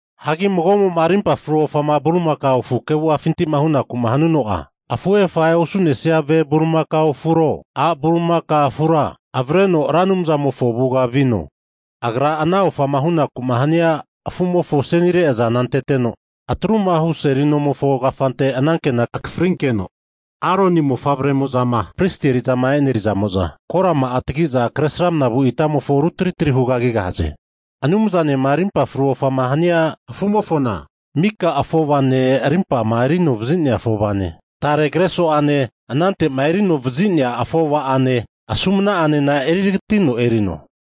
Hagi mago'mo'ma rimpa fru ofama bulimakao afu kevu'afintima hunaku'ma hanuno'a, afuhe afahe'ma osu'nesia ve bulimakao afuro, a' bulimaka afura avreno Ra Anumzamofo avuga vino. Agra ana ofama hunaku'ma hania afu'mofo asenire azana anteteno, atrumahu seli nomofo kafante anankena akafrinkeno, Aroni mofavre'mo'zama pristi eri'zama e'nerizamo'za korama'a tagi'za, kresramna vu itamofona rutri tri hugagigahaze. Anumzanema rimpa fru ofama hania afu'mofona, miko afova'ane, rimpama eri anovazi'nea afovane, tare kreso'ane anante'ma eri anoma vazi'nea afova'ane, asumna'anena eritagatino erino,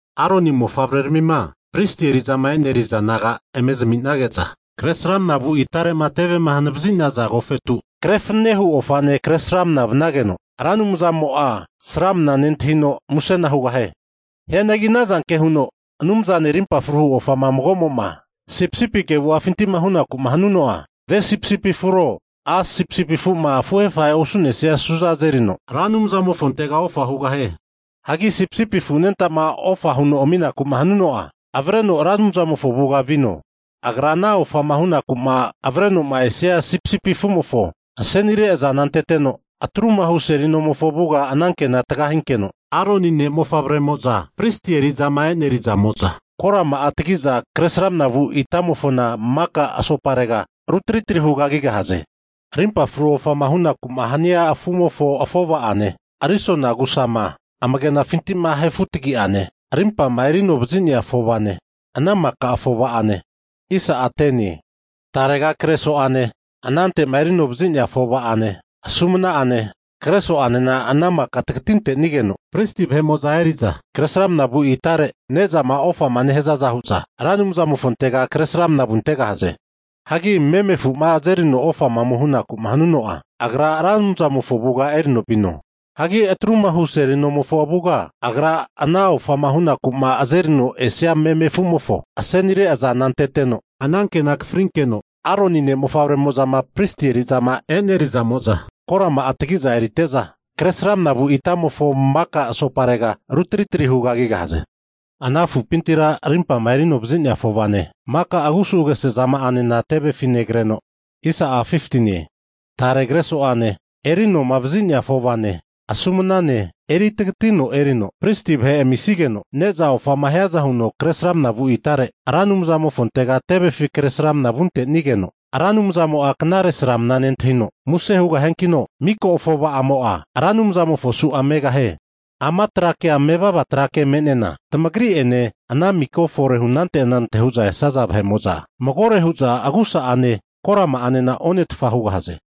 Aroni mofavre'ramima Pristi eri'zama e'neri'za naga eme zaminige'za kresramna vu itare'ma tevema hanavazi'naza agofetu, kre fananehu ofane kresramana vanageno, Ra Anumzamo'a sramna mana nentahino musena hugahie. Hianagi anazanke huno Anumzanema arimpa fru ofama mago'mo'ma sipisipi kevu'afinti'ma hunaku'ma hanuno'a, ve sipisipi afuro a' sipisipi afu'ma afuhe afahe'ma osu'nesia su'za azerino Ra Anumzamofontega ofa hugahie. Hagi sipisipi afu anenta'ma ofa huno aminaku'ma hanuno'a, avreno Ra Anumzamofo avuga vino. Agra ana ofama hunaku'ma avrenoma esia sipisipi afumofo asenire azana anteteno, atrumahu seli nomofo avuga anankena tagahinkeno, Aroni ne' mofavre'mo'za pristi eri'zama e'neri'zamo'za korama'a tagi'za kresramna vu itamofona maka asoparega rutri tri hugagigahaze. Rimpa fru ofama hunaku'ma hania afuteti'ma erisia, afova'ane risona agu'sama, amagenafinti ahe futagi'ane, rimpama eri anovazi'nea afova'ane, ana maka afova'ane, tarega kreso'ane, anante'ma erino vazi'nea afova'ane, asumna'ane, kreso'anena ana maka tagatintenigeno, pristi vahe'mo'za eri'za kresramna vu itare ne'zama ofama nehazaza hu'za Ra Anumzamofontega kresramana vuntegahaze. Hagi meme afu'ma azerino ome ofama hunaku'ma hanuno'a, agra Ra Anumzamofo avuga erino vuteno, atru'ma hu seli nomofo avuga agra ana ofama hu'naku'ma azerino esia meme afu'mofo asenire azana anteteno, anankena akafrinkeno, Aroni ne' mofavre'zamo'zama pristi eri'zama e'neri'zamo'za korama'a tagi'za erite'za kresramna vu itamofo maka asoparega rutri tri hugagigahaze. Ana afupintira arimpama erinovazi'nea afovane, maka agusu agesezama'anena, tevefi negreno, tare kreso'ane, erinoma vazi'nea afovane, asumnane, eri tagatino erino, Pristi vahe amisigeno, ne'za ofama hiaza huno kresramna vu itare Ra Anumzamofontega tevefi kresramna vuntenigeno, Ra Anumzamo'a knare sramna nentahino muse hugahiankino, miko afova'amo'a Ra Anumzamofo su'a megahie. Ama tra kea mevava trake me'nena, tamagri'ene ana miko fore hunante anante hu'za esaza vahe'mo'za, magore hu'za agusa'ane, korama'anena onetfa hugahaze.